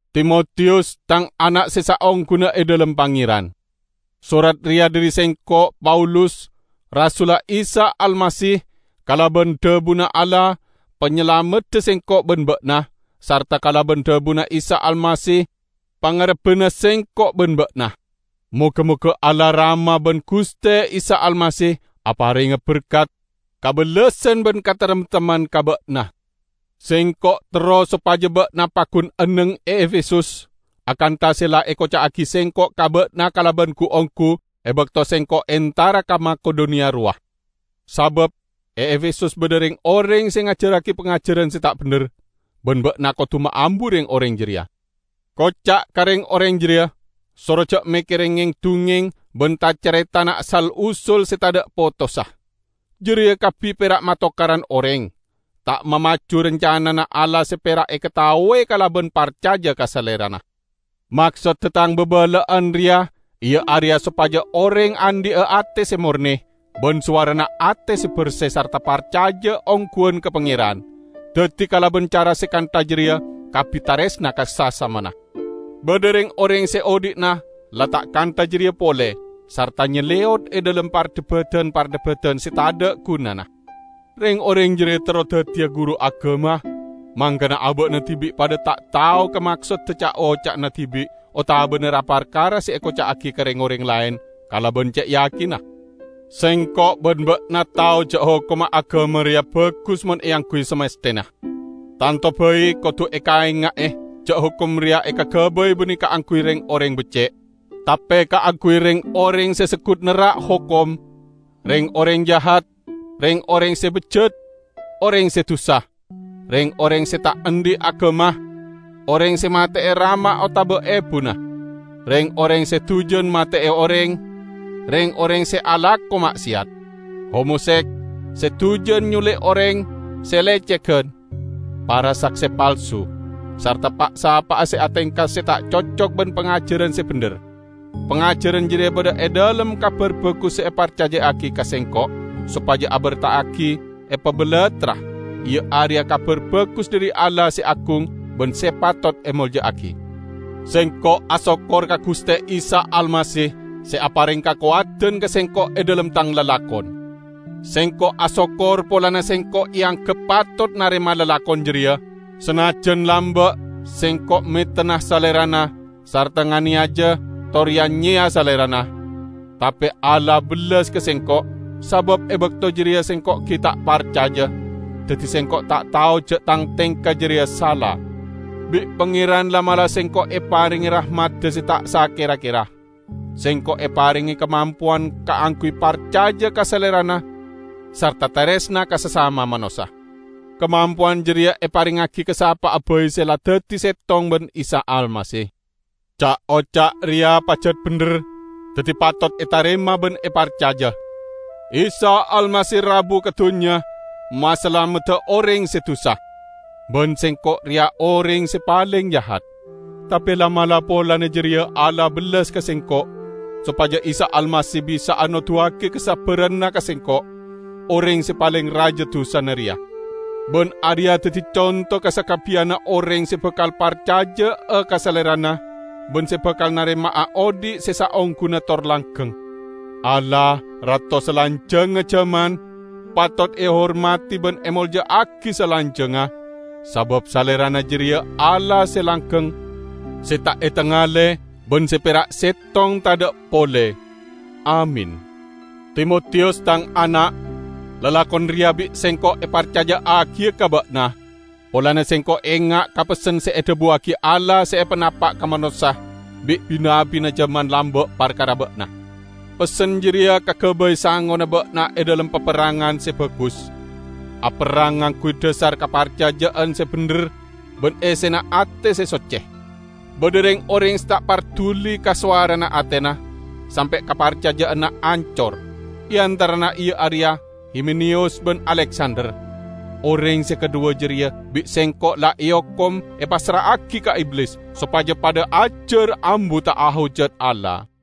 Timotiyus, tang ana' se saongguna e dhalem Pangeran! Sorat reya dhari sengko', Paulus, rasulla Isa Almasih kalaban dhabuna Allah, Panyalamedda sengko' ban ba'na, sarta kalaban dhabuna Isa Almasih, pangarebbanna sengko' ban ba'na. Moga-moga Allah Rama ban Guste Isa Almasih aparenga berkat, kabellasan ban kataremtemman ka ba'na. Sengko' terro sopaja ba'na paggun enneng e Efesus, akantha se la ekoca'agi sengko' ka ba'na kalaban gu-onggu e bakto sengko' entara ka Makedoniya rowa. Sabab e Efesus badha reng-oreng se ngajarragi pangajaran se ta' bendher, ban ba'na kodu maambu reng-oreng jareya. Koca' ka reng-oreng jareya, soro ja' mekkere ngeng-dungngeng ban ta-caretana sal-usul se tadha' potossa. Jareya kabbi pera' matokaran oreng, ta' mamaju rancanana Allah se pera' ekataowe kalaban parcaja ka Salerana. Maksodda tang babala'an reya iya areya sopaja oreng andhi'a ate se morne, ban sowarana ate se berse sarta parcaja ongguwan ka Pangeran, daddi kalaban cara se kantha jareya kabbi taresna ka sasamana. Badha reng-oreng se odhi'na la ta' kantha jareya pole, sarta nyaleyot e dhalem pardhebadan-pardhebadan se tadha' gunana. Reng-oreng jareya terro daddiya guru agama, mangkana aba'na dibi' padha ta' tao ka maksodda ca'-oca'na dibi' otabana ra-parkara se ekoca'agi ka reng-oreng laen kalaban ce' yakinna. Sengko' ban ba'na tao ja' hokomma agama reya bagus mon eangguy samasthena. Tanto bai kodu ekaenga'e, ja' hokom reya ekagabay banne kaangguy reng-oreng becce', tape kaangguy reng-oreng se seggut nerrak hokom, reng-oreng jahat, reng-oreng se bejjat, oreng se dusa, reng-oreng se ta' andhi' agama, oreng se mate'e rama otaba ebuna, reng-oreng se dujan mate'e oreng, reng-oreng se alako ma'seyat, homoseks, se dujan nyuli' oreng, se lecegan; para sakse palsu, sarta pa'-sapa'a se atengka se ta' cocok ban pangajaran se bendher. Pangajaran jareya badha e dhalem Kabar Bagus se eparcaja'agi ka sengko' sopaja eberta'agi epabalattra, iya areya Kabar Bagus dhari Allah se agung ban se patot emolja'agi. Sengko' asokkor ka Guste Isa Almasih se apareng kakowadan ka sengko' e dhalem tang lalakon. Sengko' asokkor polana sengko' eanggep patot narema lalakon jareya, sanajjan lamba' sengko' metenna Salerana sarta nganeyaja tor ya-nyeya Salerana. Tape Allah bellas ka sengko', sabab e bakto jareya sengko' gi' ta' parcaja, daddi sengko' ta' tao ja' tang tengka jareya sala. Bi' Pangeran la'-mala' sengko' eparenge rahmadda se ta' sakera-kera. Sengko' eparenge kamampowan kaangguy parcaja ka Salerana sarta taresna ka sasama manossa. Kamampowan jareya eparengngagi ka sapa'a bai se la daddi settong ban Isa Almasih. Ca'-oca' reya pajat bendher -- daddi patot etarema ban eparcaja -- "Isa Almasih rabu ka dunnya masalamedda oreng se dusa." Ban sengko' reya oreng se paleng jahat. Tape la'-mala' polana jareya Allah bellas ka sengko', sopaja Isa Almasih bisa'a noduwagi kasabbaranna ka sengko', oreng se paleng raja dusana reya. Ban areya daddi conto ka sakabbiyanna oreng se bakal parcaja'a ka Salerana ban se bakal narema'a odhi' se saongguna tor langgeng. Allah, Rato salanjangnga jaman, patot ehormadi ban emolja'agi salanjangnga, sabab Salerana jareya Allah se langgeng, se ta' etangale ban se pera' settong tadha' pole! Amin. Timotiyus, tang ana'! Lalakon reya bi' sengko' eparcaja'agiya ka ba'na, polana sengko' enga' ka pessen se edhabuwagi Allah se epanapa' ka manossa bi' bi-nabbi jaman lamba' parkara ba'na. Pessen jareya kagabay sangona ba'na e dhalem paperrangan se bagus. Aperrang ngangguy dhasar kaparcaja'an se bendher ban essena ate se socce. Badha reng-oreng se ta' parduli ka sowarana atena, sampe' kaparcaja'anna ancor. E antarana iya areya Himeneyus ban Aleksander. Oreng se kadhuwa jareya bi' sengko' la eokom epassra'agi ka Iblis, sopaja padha ajar ambu ta' ahojat Allah.